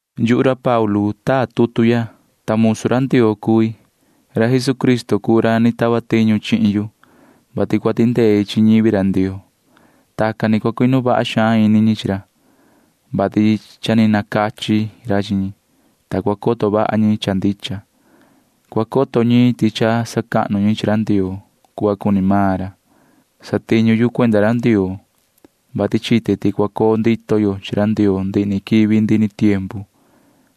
Yuhu ra Paulu taa tutu ya, ta musu ra Ndioo cui. Jesucristo cuu ra ni tava tiñu chihin yu, vati cua tindei chi ñivi ra Ndioo. Tacan ni cua cuinu vaha xaan ini ñi chi ra, vati ni nacachi ra chihin ñi, ta cua coto vaha ñi cha ndicha. Cua coto ñi ti cha sacahnu ñi chi ra Ndioo cuhva cuni maan ra. Satiñu yu cuenda ra Ndioo, vati chite ti cha cua coo ndito yo chi ra Ndioo ndihi ni quivi ndihi ni tiempu.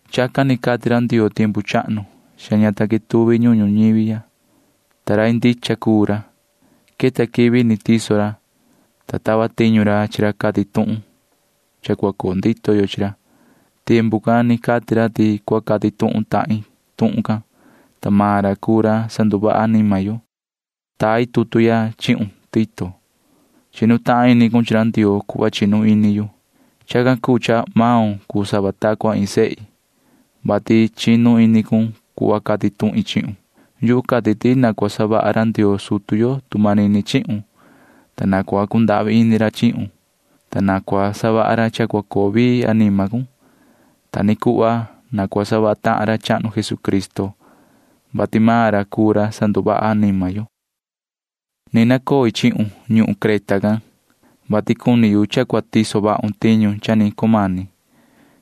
Chacan ni cati ra Ndioo tiempu chahnu cha ña ta quetuvi ñuhun ñuñivi ya, ta rai ndicha cuu ra. Queta quivi cha ni tiso ra, ta tava tiñu ra chi ra cati tuhun tuhun cua coo ndito yo chi ra. Tacan ni cati tuhun ra ti cua cati tuhun tahin tuhun can, ta maan ra cuu ra sanduvaha anima yo. Tai tutu ya chihun, yoho Tito. Chinu tahan ini maun chi ra Ndioo cuhva chinu ini yu. Chacan cuu cha maun cuu sava ta cua iin sehi, [vati chinu ini cun cuhva cati tuhin chihun]. Yuhu cati ti na cua savaha ra Ndioo sutu yo tu manini chihun, ta na cua cundahvi ini ra chihun, ta na cua savaha ra cha cua coo vii anima cun. Ta ni cuhva na cua savaha tahan ra chahnu Jesucristo, ta maan ra cuu ra sanduvaha anima yo. Ni nacoi chihun ñuhun Creta can, vati cuni yu cha cua tiso vahun tiñu cha ni cumani.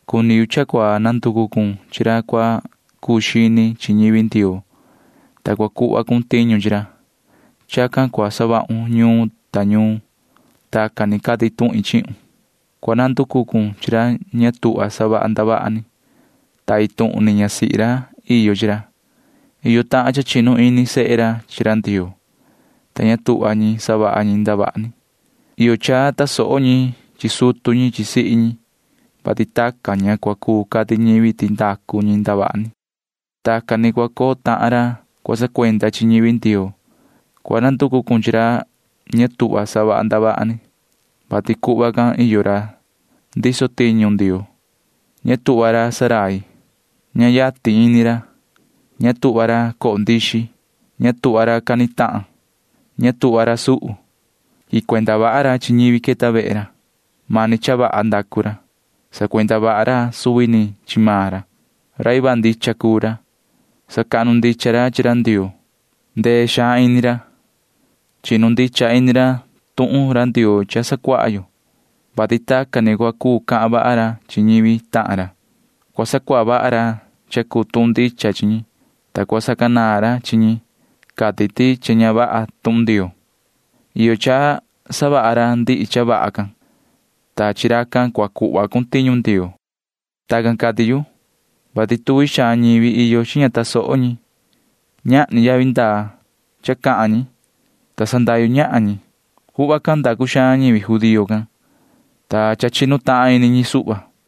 Cuni yu cha cua nanducu cun chi ra cua cuu xini chi ñivi Ndioo, ta cua cuhva cun tiñu chi ra. Chacan cua savahun ñuun ta ñuun. Tacan ni cati tuhin chihun. Cua nanducu cun chi ra ña tuhva savaha ndavaha ni, ta iin tuhun ni ñasihi ra iyo chi ra. Iyo cha chinu tahan ini sehe ra chi ra Ndioo, ta ña tuhva ñi savaha ñi ndavaha ni. Iyo cha tasoho ñi chi sutu ñi chi sihi ñi, ta tacan ni ña cua cuu cati ñivi ti ndavaha ni savaha ñi. Tacan ni cua coo tahan ra cua sacuenda chi ñivi Ndioo. Cua nanducu cun chi ra ña tuhva savaha ndavaha ni, vati tacan ni iyo ra ndiso tiñu Ndioo. Iyo cha ña tuhva ra ndurai. Iyo cha ña yatin iyo ini ra. Iyo cha ña tuhva ra chihi. Iyo cha ña tuhva ra cani tahan. Iyo cha ña tuhva ra suhu. Iyo cha quihin cuenda vaha ra chi ñivi queta vehe ra. Iyo cha savaha ra cha vaha. Iyo cha sacuenda vaha ra suvi ni chi maan ra. Iyo cha cuu ra rai vaha ndicha. Iyo cha sacahnu ndicha ra chi Ndioo. Iyo cha sandee ini ra. Iyo cha chinu vaha ini ra tuhun ndicha tuhun Ndioo cha sacuaha yo chi ra. Tacan ni cua cuu cahan vaha ra chi ñivi tahan ra. Cua sacuaha vaha ra cha cuu tuhun ndicha chi ñi, ta cua sacanaan ra chi ñi cati ti ña vaha tuhun Ndioo. [Iyo cha savaha ra ndihi cha vaha can, ta chi racan ni cua cuhva cun tiñu Ndioo.] Tacan cati yu, vati iyo cuaha xaan ñivi ña tasoho. Ñahni yavi ndaa cha cahan ñi, ta sandahyu ñahan ñi. Tacan ni savaha xaan ñivi judío can, ta cha chinu tahan ini ñi suhva.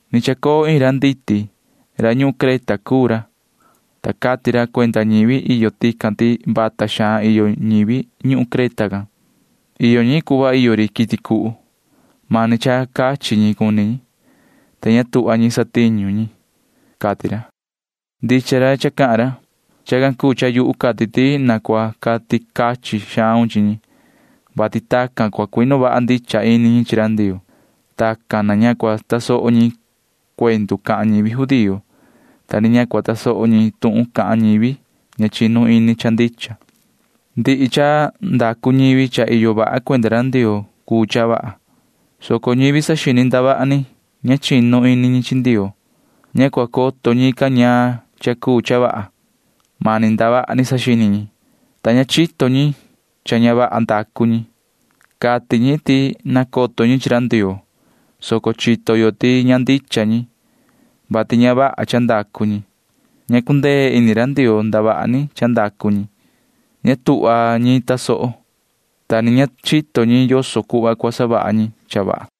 Ni chacoo iin ra nditi. Suvi ra ñuhun Creta can cuu ra, ta cati ra cuenda ñivi iyo tican ti vata xaan iyo ñivi ñuhun Creta. Iyo ñi cuhva iyo ri quiti cuhu. Mani cha cachi ñi cuni ñi, ta ña tuhva ñi satiñu ñi, cati ra. Ndicha cuhva cati ra. Chacan cuu cha yuhu cati ti na cua cati cachin xaun chi ñi, vati tacan cua cuinu vaha ndicha ini ñi chi ra Ndioo. Tacan ni ña cua tasoho ñi cuendu cahan ñivi judío, ta ni ña cua tasoho ñi tuhun cahan ñivi, ta ñican cuu ñivi ña chinu ini cha ndicha. Ndihi cha ndacu ñivi cha iyo vaha cuenda ra Ndioo cuu cha vaha, soco ñivi saxini ndavaha ni ñivi ña chinu ini chi Ndioo―ña cua coto ñican ñaan cha cuu cha vaha. Mani ndavaha ni saxini ñi, ta ña chito ñi cha ña vaha ndacu ñi. Cati ñi ti nacoto ñi chi ra Ndioo, soco chito yo ti ña ndicha ñi, vati ña vaha cha ndacu ñi. Ña cundee ini ra Ndioo ndavaha ni cha ndacu ñi. Ña tuhva ñi tasoho ñi, ta ni ña chito ñi yoso cuhva cua savaha ñi cha vaha.